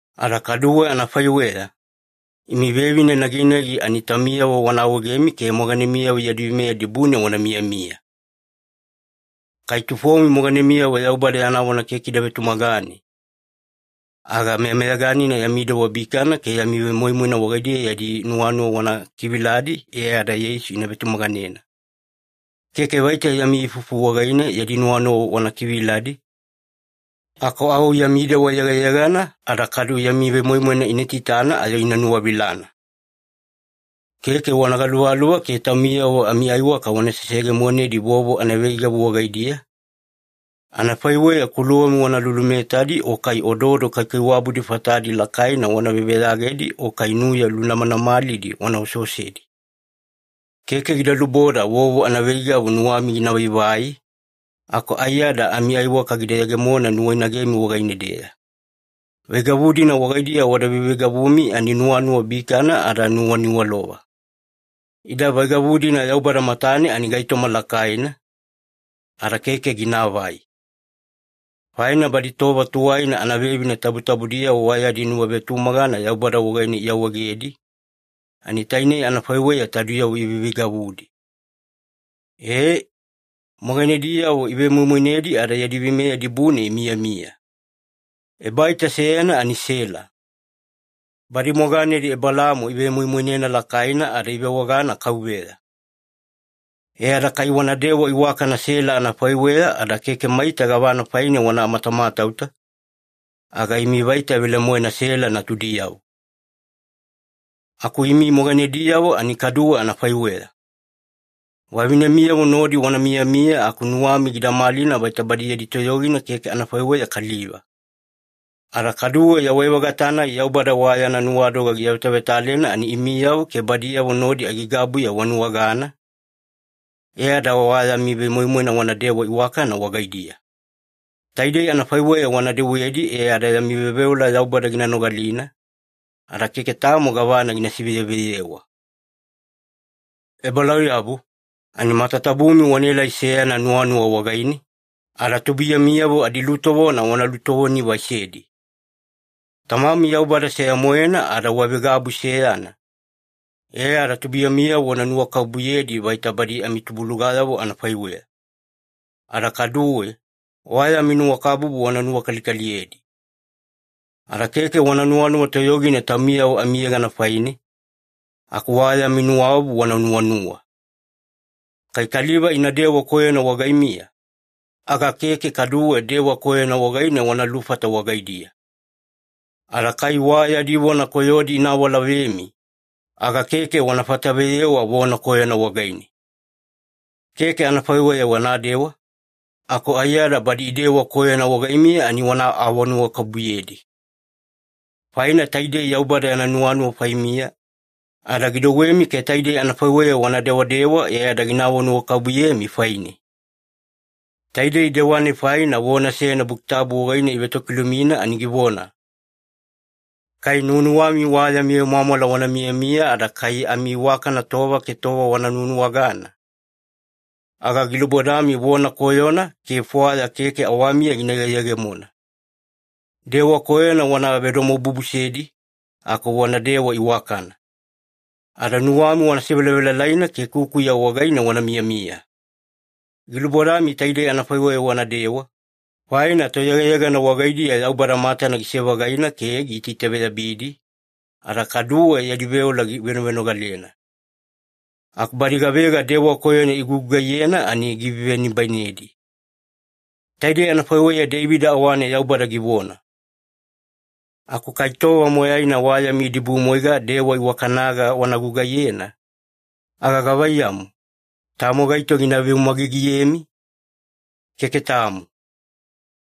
Ada kaduwe anafaiweya, imi vevine naginagi ani taumiyavo wana awaegemi ke moganemiyavo yadi veimeya dibune wana miyamiya. Kai tufomi moganemiyavo Yaubada yana vona keke ida vetumagane, aga meyameyaganina yami dewa bikana ke yami vemoimoina wagaidiya yadi nuwanuwa wana kiviladi e ada Yeisu ina vetumaganena. Keke vaita yami ifufu wagaine yadi nuwanuwa wana kiviladi, aku au yami dewa yegayegana ada kadu yami vemoimoina ina itaitana ayo ina nuwavilana. Keke wana galuvaluva ke taumiyavo amiaiwaka wana seseyegemonedi vovo anaveigavu wagaidiya, anafaiweya kuluwami wana lulumetadi, o kai ododo kaikaiwabudi fatadi lakaina wana veveyagedi, o kai nuya lunamanamalidi wana oseosedi. Keke gida luboda vovo anaveigavu nuwami gina vaivai, aku aiyada amiaiwaka gida yegemona nuwainagemi wagaine-deya. Veigavu-dina wagaidiya wada veiveigavumi ani nuwanuwa bikana ada nuwaniwalova. Ida veigavu-dina Yaubada matane ani gaitoma lakaina, ada keke ginaavai. Faina badi tova tuwaina anavevine tabutabudiyavo wa yadi nuwavetumagana Yaubada wagaine iawaegedi, ani tainei anafaiweya taudiyavo iveiveigavudi. Ee, moganediyavo ivemoimoinedi ada yadi veimeya dibune imiyamiya. Ebaita seyana ani Sela. Badi moganedi Ebelaamo ivemoimoinena lakaina ada ivewagana ‘kauveya’. E ada kai wanadewa iwakana Sela anafaiweya ada keke maita gavana faine wana matamatauta, aga imi vaita velemoena Sela natudiyavo. Aku imi moganediyavo ani kaduwe anafaiweya. Vavinemiyavo nodi wana miyamiya aku nuwami gida malina vaita badi yadi toyogina keke anafaiweya kaliva. Ada kaduwe yawai-vagata-nai Yaubada wa yana nuwadoga giavetavetalena ani imiyavo ke badiyavo nodi aigaigabuya wanuwagana, e ada wa yami vemoimoina wanadewa iwakana wagaidiya. Taidei anafaiweya wana dewedi e ada yami veoveola Yaubada gina nogalina, ada keke tamo gavana gina siveyeveyewa. Ebalauyabu, ani matatabumi wanaelai seyana nuwanuwa wagaine, ada tubuiyamiyavo adilutovona wana lutovoni-vaisedi. Tamami Yaubada seya-moena ada wavegabu seyana, e ada tubuiyamiyavo wana nuwakabubuyedi vaita badi amitubulugayavo anafaiweya. Ada kaduwe, wa yami nuwakabubu wana nuwakalikaliyedi. Ada keke wana nuwanuwa toyogina taumiyavo amiyegana faine, aku wa yami nuwaobu wana nuwanuwa. Kai kaliva inadewa koyona wagaimiya, aga keke kaduwe dewa koyona wagaine wana lufata wagaidiya. Ada kai wa yadi vona koyodi ina awalavemi, aga keke wana fataveyewa vona koyona wagaine. Keke anafaiweya wanadewa, aku aiyada badi idewa koyona wagaimiya ani wana awanuwakabubuyedi. Faina taidei Yaubada yana nuwanuwa faimiya, ada gidouwemi ke taidei anafaiweya wana dewadewa e ada gina awanuwakabubuyemi faine. Taidei dewa-nai faina vona seyana Buki Tabu wagaine ivetokilumina ani givona, “Kai nuwanuwami wa yami vemwamwala wana miyamiya ada kai amiiwakana tova ke tova wana nuwanuwagana, aga gilubodami vona koyona ke fwaya keke awamiya gina yegeyegemona. Dewa koyona wana vedomobubusedi aku wanadewa iwakana. Ada nuwami wana sevelavelalaina ke kukuya wagaine wana miyamiya. Gilubodami taidei anafaiweya wanadewa, faina toyegayegana wagaidiya Yaubada matana gise-vagaina ke giitaitaveyabidi, ada kaduwe yadi veola givenovenogalena. Aku badi gavega dewa koyona igugugaiyena ani givevenibainedi.” Taidei anafaiweya Deivida awane Yaubada givona. Aku kai tova moyaina wa yami idibumwaiga dewa iwakanaga wana gugugaiyena, aga gavaiyamu, tamo gaito gina veumagigiyemi? Keke tamo.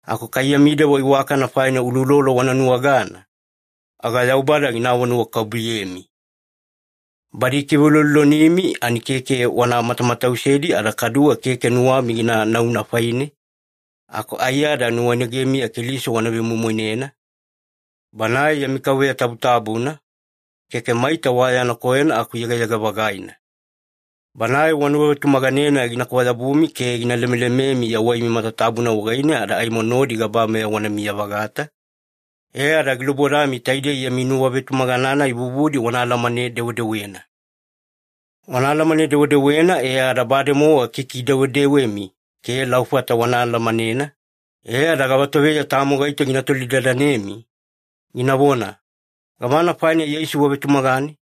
Aku kai yami dewa iwakana faina uloulolo wana nuwagana, aga Yaubada gina awanuwakabubuyemi. Badi ikiveuloulolonimi ani keke wana matamatausedi ada kaduwe keke nuwami gina nauna faine, aku aiyada nuwainagemiya Keliso wana vemoimoinena, Banae yami Kauveya tabutabuna, keke maita wa yana koyona aku yegayega-vagaina. Banae wanuwavetumaganena gina kwayabumi ke gina lemelememi yawaimi matatabuna wagaine ada aimo nodi gabameya wanamiya-vagata, e ada gilubodami taidei yami nuwavetumagana-nai vuvudi wana alamane-dewedewena. Wana alamane-dewedewena e ada bademowa kikidewedewemi ke laufata wana alamanena, e ada gavatoveya tamo gaito gina tolidadanemi, ginavona, “Gavana faina Yeisu wavetumagane?”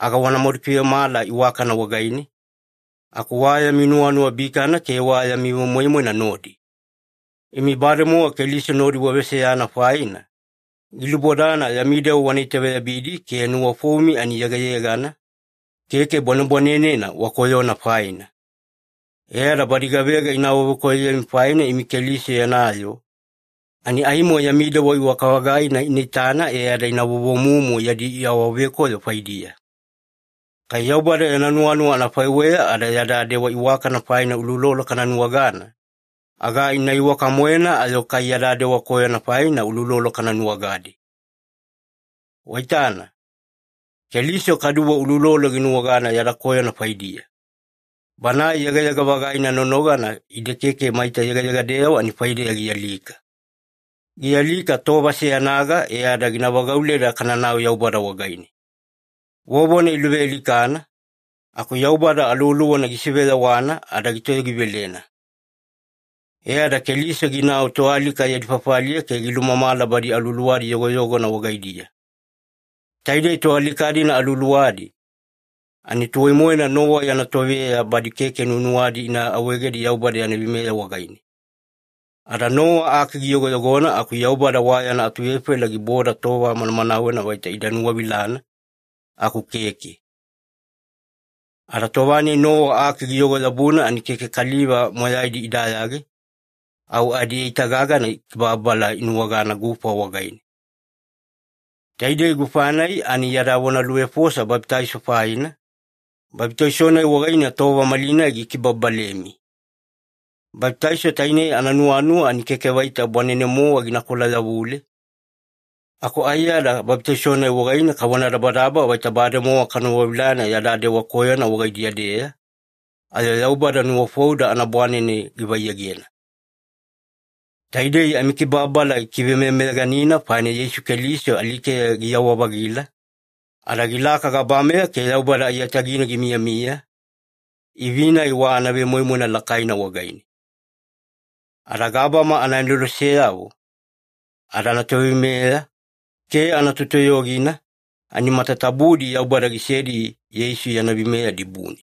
aga wanamadu kivemala iwakana wagaine, aku wa yami nuwanuwa bikana ke wa yami vemoimoina nodi. Imi bademowa Keliso nodi waveseyana faina, gilubodana yami dewa wana itaveyabidi ke nuwafoumi ani yegayegana, keke bwanebwanenena wakoyona faina. E ada badi gavega ina awavekoyoyemi faina imi Keliso yana yoo, ani aimo yami dewa iwaka-vagaina ina itana e ada ina vovomumu yadi awavekoyo faidiya. Kai Yaubada yana nuwanuwa anafaiweya ada yada dewa iwakana faina uloulolo kana nuwagana, aga ina iwaka-moena ayo kai yada dewa koyona faina uloulolo kana nuwagadi. Waitana, Keliso kaduwe uloulolo ginuwagana yada koyona faidiya. Banae yegayega-vagaina nonogana ide keke maita yegayegadeyavo ani faideya gialika. Gialika tova seyanaga e ada gina vagauleda kananau Yaubada wagaine. Vovona iluvealikana, aku Yaubada Aluwaluwana gisiveyawana ada gitoyogivelena. E ada Keliso ginau toalika yadi fafaliya ke gilumamala badi aluwaluwadi yogoyogona wagaidiya. Taidei toalika-dina aluwaluwadi, ani tuwai-moena Nowa yana toveya badi keke nuwanuwadi ina awaegedi Yaubada yana veimeya wagaine. Ada Nowa aki giyogoyogona aku Yaubada wa yana atuvefaila giboda tova manamanawena vaita ida nuwavilana, aku keke. Ada tova-nai Nowa aki giyogo-yabuna ani keke kaliva moyaidi idayage, au adieita gagana kibababala inuwagana gufa wagaine. Taidei gufa-nai ani yada vonaluvefosa babitaiso faina, babitaiso-nai wagaine tova malinai gikibababalemi. Babitaiso tainei ananuwanuwa ani keke vaita bwanene-mowa ginakola-yavule, aku aiyada babitaiso-nai wagaine kavonadabadaba vaita bademowa kanuwavilana yada dewa koyona wagaidiya-deya, ayo Yaubada nuwafouda anabwanene givaiyegena. Taidei amikibababala gikivemeyameyaganina faina Yeisu Keliso alikeya giyawa-vagila, ada gilaka gabameya ke Yaubada aiyatagine gimiyamiya, ivi-nai wa anavemoimoina lakaina wagaine. Ada gabama anaaneloseyavo, ada anatoveimeya, ke anatotoyogina, ani matatabudi Yaubada gisedi Yeisu yana veimeya dibune.